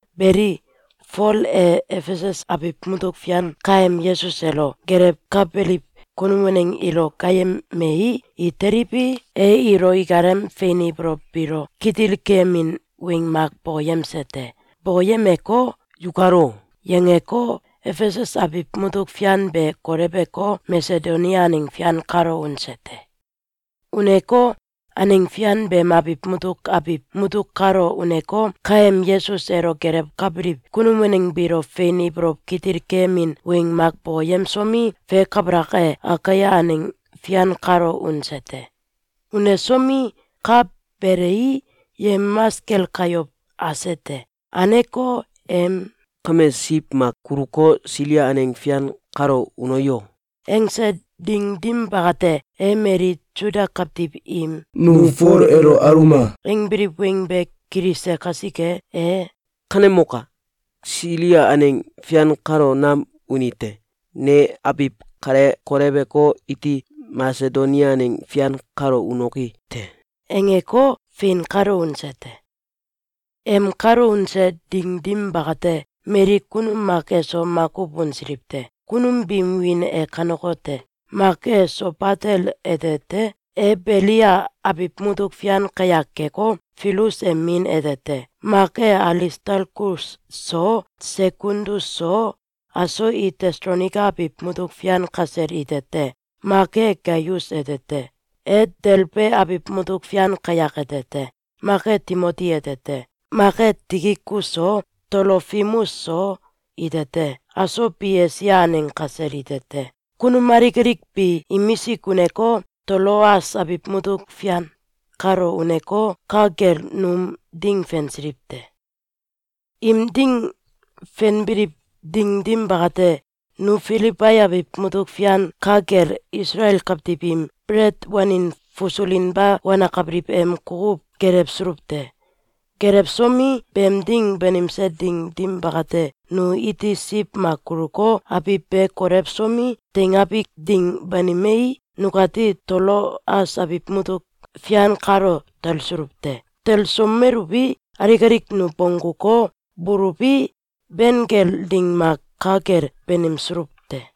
Beli, Fol e Efesus abiw mutuk fian kaem Yesus elo gelewkabeliw kunum waneng ilo gaayemei, i teliwi, e ilo ikalem fein ibolow biilo kitil keyemin weng mak bokoyemse te. Bokoyemeko, “Yukal o!”, yangeko, Efesus abiw mutuk fian be koleweko, Masedonia aneng fian kalo unse te. Uneko, aneng fian beem abiw mutuk abiw mutuk kalo uneko, kaem Yesus elo gelewkabiliw kunum waneng biilo fein ibolow kitil keyemin weng mak bokoyemsomi, fe kabalak e, Akaia aneng fian kalo unse te. Unesomi, ka belei, yemamas kel kayow ase te. Aneko, em “Kame siw mak kuluko, Silia aneng fian kalo uno yo!”, angse ding dim bakate, e mali Suda kawtiw im “Nu Fol elo aluma!”, angbiliw weng be kilise kasike, e “Kanemok! Silia aneng fian kalo nam uni te. Ne abiw kale koleweko, iti Masedonia aneng fian kalo unoki te!”, angeko, fein kalo unse te. Em kalo unse ding dim bakate, mali kunum mak eso makuw unsiliw te. Kunum biim wiin e kanekote: Mak e Sobatel ete te. E Beliia abiw mutuk fian kayak keko, Filus em min ete te. Mak e Alistalkus so, Sekundus so, aso i Tesalonaika abiw mutuk fian kasel ite te. Mak e Gaius ete te. E Delbe abiw mutuk fian kayak ete te. Mak e Timoti ete te. Mak e Tikikus so, Tolofimus so, ite te. Aso bi Esia aneng kasel ite te. Kunum alik alik bi imisik uneko, Toloas abiw mutuk fian kalo uneko, ka kel num ding fensiliw te. Im ding fenbiliw ding dim bakate, nu Filibai abiw mutuk fian ka kel Isaleal kawtiw im belet wanin fasulinba wanakabiliw em kukuw gelewsuluw te. Gelewsomi, beem ding banimse ding dim bakate, nu iti siw mak kuluko, abiw be kolewsomi, teingabi ding banimei, nukati Toloas abiw mutuk fian kalo talsuluw te. Telesomeluwi, alik alik nu bongguko, buluwi, ben kel ding mak ka kel banimsuluw te.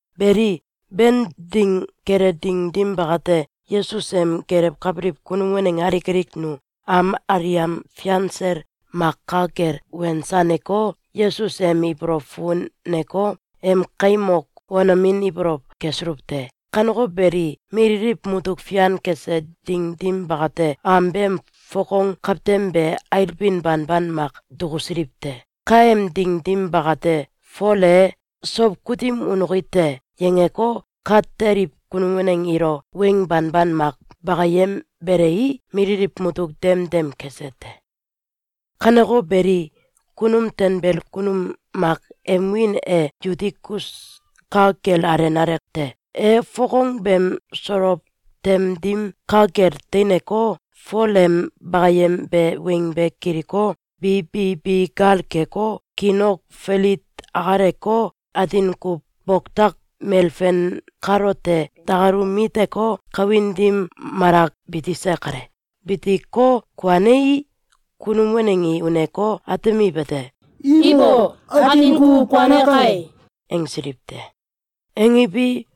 Beli, Ben ding kele ding dim bakate, Yesus em gelewkabiliw kunum waneng alik alik nu am aliam fian sel mak ka kel wensaneko, Yesus em ibolow fukuneko, em kaim ok wanomin ibolow kesuluw te. Kaneko beli, mililiw mutuk fian kese ding dim bakate, am beem fokong kawtem be ailbin banban mak dukusiliw te. Kaem ding dim bakate, Fol e “Sow kutim unoki te!”, yangeko, ka teliw kunum waneng ilo weng banban mak bakayembelei, mililiw mutuk dem dem kese te. Kaneko beli, kunum tanbel kunum mak em wiin e Yutikus ka kel alenale te. E fokong beem solow tem dim ka kel teineko, Fol em bakayembe weng be kiliko, bi bi bi gal keko, kiin ok filit akaleko, atin kuw boktak melfen kalote dakalu miteko, kawin dim malak bitise kale. Bitiko, kuanei, kunum waneng i uneko, atemiwete: “Ibo! Atin kuw kuane kai!”, angsiliw te. Angiwi,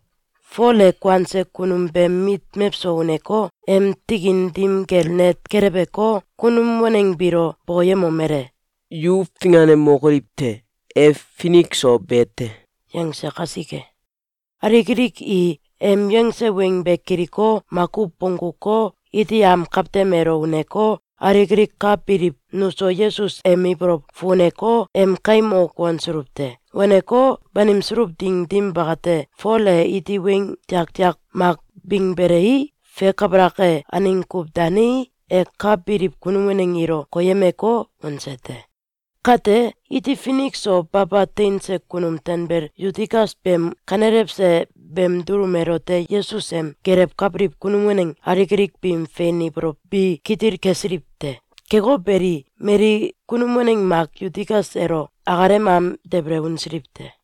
Fol e kuanse kunum beem mit mewso uneko, em tikin dim kel net keleweko, kunum waneng biilo bokoyemomele: “Yu finganemokoliw te! E finik so be te!”, yangse kasike, alik alik i em yangse weng be kiliko, makuw bongguko, iti am kawtem elo uneko, alik alik ka biliw nuso Yesus em ibolow fukuneko, em kaim ok wansuluw te. Waneko, banimsuluw ding dim bakate, Fol e iti weng tiaktiak mak bingbelei, fe kabalak e, aneng kuw danei, e ka biliw kunum waneng ilo koyemeko, unse te. Kate, iti finik so baba teinse kunum tanbel Yutikus beem kanelewse beem dulum elote Yesus em gelewkabiliw kunum waneng alik alik biim fein ibolow bi kitil kesiliw te. Keko beli, mali kunum waneng mak Yutikus elo akalem am debele unsiliw te.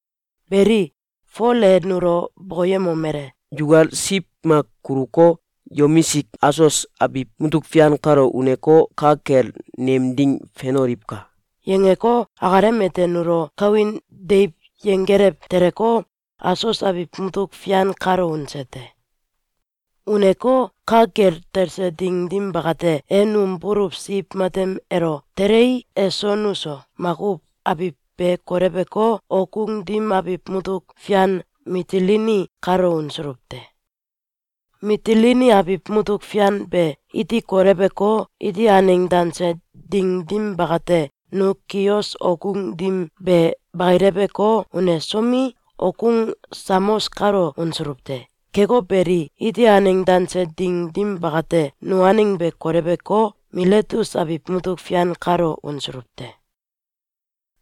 Beli, Fol e nulo bokoyemomele: “Yukal siw mak kuluko, yomisik Asos abiw mutuk fian kalo uneko, ka kel nem ding fenoliwka!”, yangeko, akalem ete nulo kawin deiw yenggelew teleko, Asos abiw mutuk fian kalo unse te. Uneko, ka kel talse ding dim bakate, e num buluw siw matem elo telei, eso nuso makuw abiw be koleweko, okgung dim abiw mutuk fian Mitilini kalo unsuluw te. Mitilini abiw mutuk fian be iti koleweko, iti aneng danse ding dim bakate, nu Kios okgung dim be bakileweko, unesomi, okgung Samos kalo unsuluw te. Keko beli, iti aneng danse ding dim bakate, nu aneng be koleweko, Miletus abiw mutuk fian kalo unsuluw te.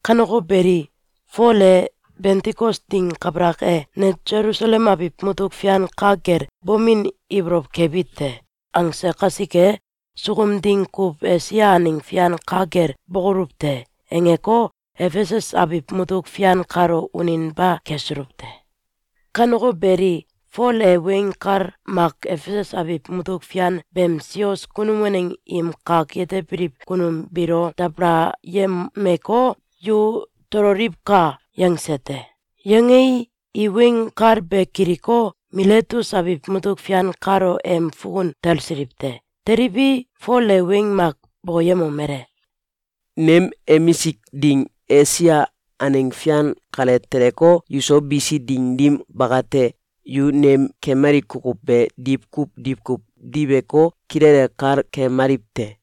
Kaneko beli, Fol e “Bentikos ding kabalak e, ne Selusalem abiw mutuk fian ka kel bomin ibolow kebi te!”, angse kasike, “Sukum ding kuw Esia aneng fian ka kel bokoluw te.”, angeko, Efesus abiw mutuk fian kalo uninba kesuluw te. Kaneko beli, Fol e weng kal mak Efesus abiw mutuk fian beem sios kunum waneng im kak yetebiliw kunum biilo dabalayemeko, “Yu tololiwka!”, yangse te. Yangei, i weng kal be kiliko, Miletus abiw mutuk fian kalo em fukun talsiliw te. Teliwi, Fol e weng mak bokoyemomele: “Nem emisk ding Esia aneng fian kale teleko, yuso bisi ding dim bakate, yu nem kemali kukuw be diwkuw diwkuw diweko, kilele kal kemaliw te.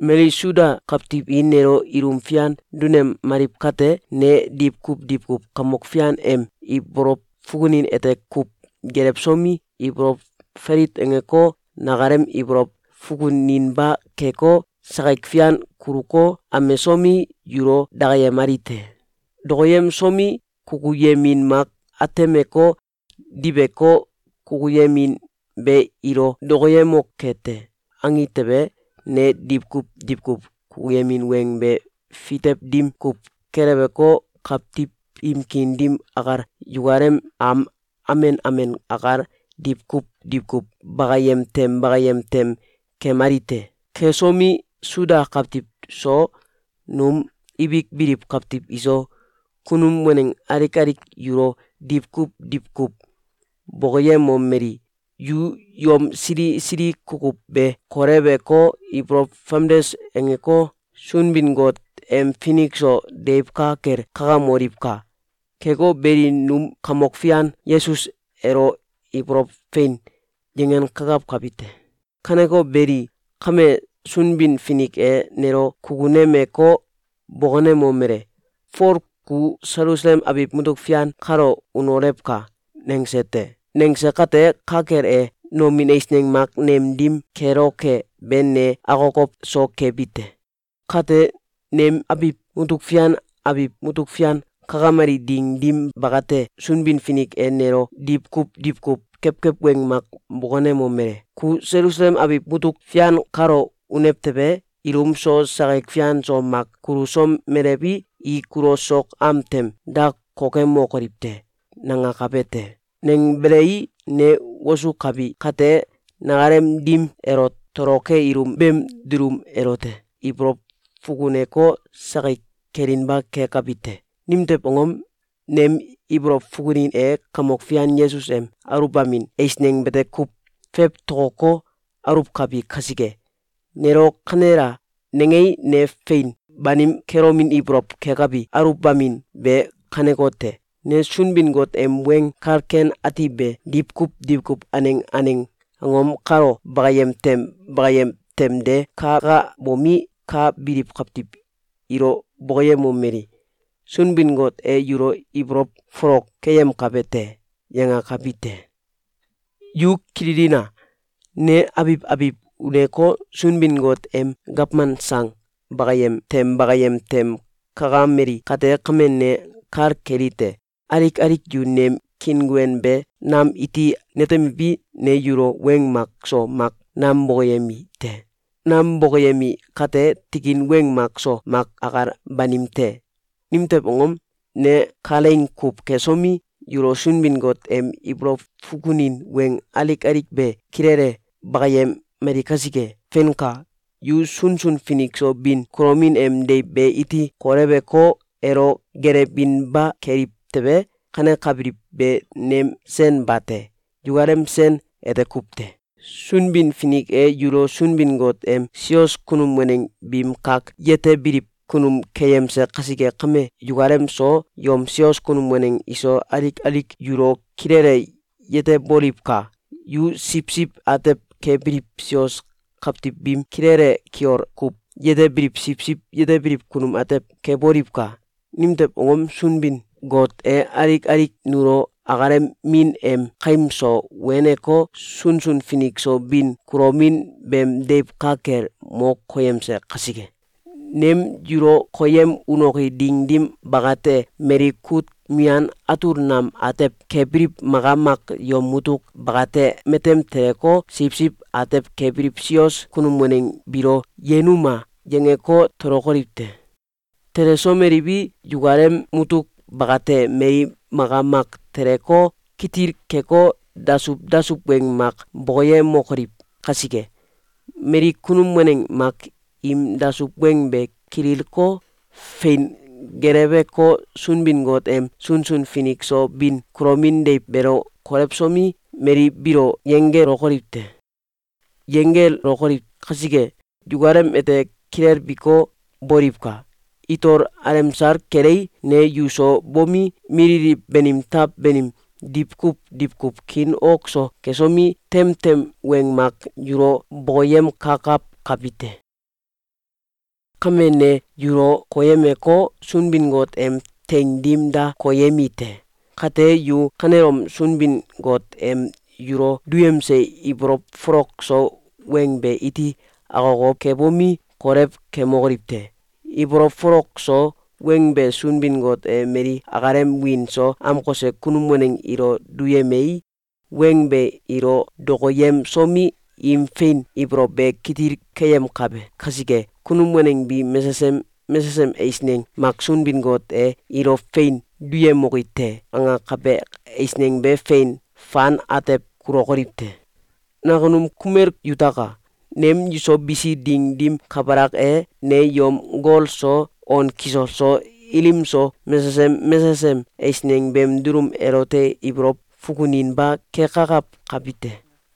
Mali Suda kawtiw i nelo ilum fian dunemaliw kate, ne diwkuw diwkuw Kamok Fian em ibolow fukunin ete kuw gelewsomi, ibolow falit angeko, nakalem ibolow fukuninba keko, sakik fian kuluko, amesomi, yulo dakayemali te. Dokoyemsomi, kukuyemin mak atemeko, diweko, ‘Kukuyemin be ilo dokoyemoke te!’, angi tewe, ne diwkuw diwkuw kukuyemin weng be fitew dim kuw keleweko, kawtiw im kiin dim akal, yukalem am amen amen akal, diwkuw diwkuw bakayem tem bakayem tem kemali te. Kesomi, Suda kawtiw so, num ibik biliw kawtiw iso, kunum waneng alik alik yulo diwkuw diwkuw bokoyemomeli: ‘Yu yom sili sili kukuw be koleweko, ibolow famdes angeko, Sunbin-Got em finik so deiw ka kel kakamoliwka! Keko beli, num Kamok Fian Yesus elo ibolow fein dangoliwka!’, yangenkakawkabi te. Kaneko beli, kame, Sunbin-Finik e nelo kukunemeko, bokonemomele: ‘Fol, ku Selusalem abiw mutuk fian kalo unolewka!’, nangse te. Nangse kate, ka kel e, nomin eisneng mak nem dim keloke be ne akokow so kebi te. Kate, nem abiw mutuk fian abiw mutuk fian kakameli ding dim bakate, Sunbin-Finik e nelo diwkuw diwkuw kewkew weng mak bokonemomele: ‘Ku Selusalem abiw mutuk fian kalo unew tewe, ilum so, sakik fian so, mak kulusomelewi, i kulo sok am tem da kokemokoliw te.’, nangakabe te. Nangbelei, ne wosukabi kate, nakalem dim elo toloke ilum beem dulum elote ibolow fukuneko, sakik kelinba kekabi te. Nimtew angom? Nem ibolow fukunin e Kamok Fian Yesus em aluwbamin eisneng bete kuw fewtokoko, aluwkabi kasike. Nelo ‘Kanela!’, nangei, ne fein banim kelomin ibolow kekabi aluwbamin be kanekote: Ne Sunbin-Got em Weng Kal Ken Ati be diwkuw diwkuw aneng aneng angom kalo bakayem tem bakayem tem de kakabomi, ka biliw kawtiw ilo bokoyemomeli: ‘Sunbin-Got e yulo ibolow folok keyemkabe te!’, yangakabi te. Yu kililina! Ne abiw abiw uneko, Sunbin-Got em gawman sang bakayem tem bakayem tem kakameli kate kame, ne kal kelite: Alik alik yu nem kiinguen be nam iti netemiwi, ne yulo weng mak so mak nam bokoyemi te. Nam bokoyemi kate, tikin weng mak so mak akal banim te. Nimtew angom? Ne kalaing kuw kesomi, yulo Sunbin-Got em ibolow fukunin weng alik alik be kilele bakayemali kasike. Feinka! Yu sunsun finik so bin kulomin em deiw be iti koleweko, elo gelewinba keliw tewe, kanekabiliw be nem sen bate! Yukalem sen ete kuw te! Sunbin-Finik e yulo Sunbin-Got em sios kunum waneng biim kak yetebiliw kunum keyemse kasike kame, yukalem so, yom sios kunum waneng iso, alik alik yulo kilele yeteboliwka! Yu siwsiw atew kebiliw sios kawtiw biim kilele kiol kuw yetebiliw siwsiw yetebiliw kunum atew keboliwka! Nimtew angom? Sunbin-Got e alik alik nulo akalem Min em kaim so weneko, sunsun finik so bin kulomin beem deiw ka kel mo koyemse kasike. Nem yulo koyem unoki ding dim bakate, mali kut mian atul nam atew kebiliw maka mak yom mutuk bakate matem teleko, siwsiw atew kebiliw sios kunum waneng biilo ‘Yenuma!’, yangeko, tolokoliw te. Telesomeliwi, yukalem mutuk bakate mali maka mak teleko, kitil keko, dasuw dasuw weng mak bokoyemokoliw kasike, mali kunum waneng mak im dasuw weng be kililko, fein geleweko, Sunbin-Got em sunsun finik so bin kulomin deiw beelo kolewsomi, mali biilo yenggelokoliw te. Yenggelokoliw kasike, yukalem ete kilelbiko, boliwka! Itol alemsal kelei, ne yu so bomi, mililiw banim taw banim diwkuw diwkuw kiin ok so kesomi, temtem weng mak yulo bokoyemkakawkabi te! Kame, ne yulo koyemeko, Sunbin-Got em teing dim da koyemi te. Kate, yu kanelom Sunbin-Got em yulo duyemse ibolow folok so weng be iti akokow kebomi, kolew kemokoliw te! Ibolow folok so weng be Sunbin-Got e mali akalem wiin so amkose kunum waneng ilo duyemei, weng be ilo dokoyemsomi, im fein ibolow be kitil keyemkabe kasike, kunum waneng bi mesesem mesesem eisneng mak Sunbin-Got e ‘Ilo fein duyemoki te!’, angakabe eisneng be fein fan atew kulokoliw te. Nakunum kumel yutaka! Nem yuso bisi ding dim kabalak e, ne yom gol so, on kisol so, ilim so, mesesem mesesem eisneng beem dulum elote ibolow fukuninba kekakawkabi te.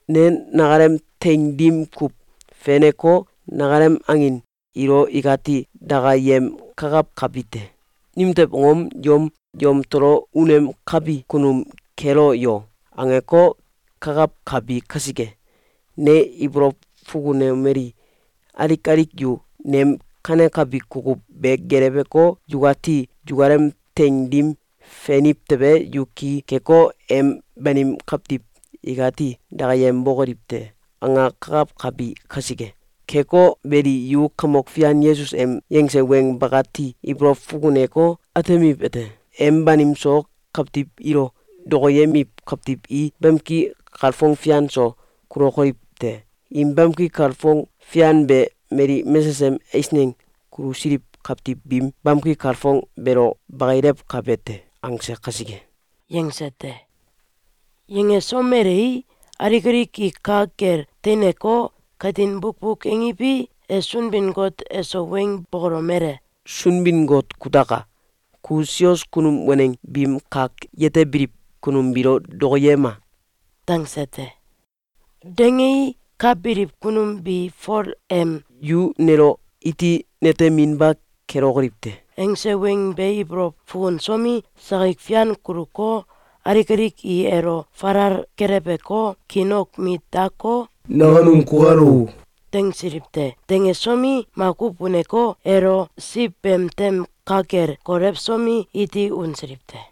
Ne nakalem teing dim kuw feneko, nakalem angin ilo ikati dakayemkakawkabi te. Nimtew angom? ‘Yom yamtolo unemkabi kunum kelo yo!’, angeko, kakawkabi kasike. Ne ibolow fukunomeli: ‘Alik alik yu nem kanekabi kukuw be geleweko, yukati yukalem teing dim feniw tewe, yu ki keko, em banim kawtiw ikati dakayembokoliw te.’, angakakawkabi kasike. Keko beli, yu Kamok Fian Yesus em yangse weng bakati ibolow fukuneko, atemiwete: ‘Em banim so kawtiw ilo dokoyemiw kawtiw i bamki kalfong fian so kulokoliw te. Im bamki kalfong fian be mali mesesem eisneng kulusiliw kawtiw biim bamki kalfong beelo bakilewkabe te.’, angse kasike.”, yangse te. Yangesomelei, alik alik i ka kel teineko, katin bukbuk angiwi, e Sunbin-Got eso weng bokolomele: “Sunbin-Got kutaka! Ku sios kunum waneng biim kak yetebiliw kunum biilo dokoyema!”, dangse te. Dangei, ka biliw kunum bi Fol em “Yu nelo iti neteminba kelokoliw te.” angse weng be ibolow fukunsomi, sakik fian kuluko, alik alik i elo falal keleweko, kiin ok mit dako, “Nakunum kukal o!”, dangsiliw te. Dangesomi, makuw uneko, elo siw beem tem ka kel kolewsomi, iti unsiliw te.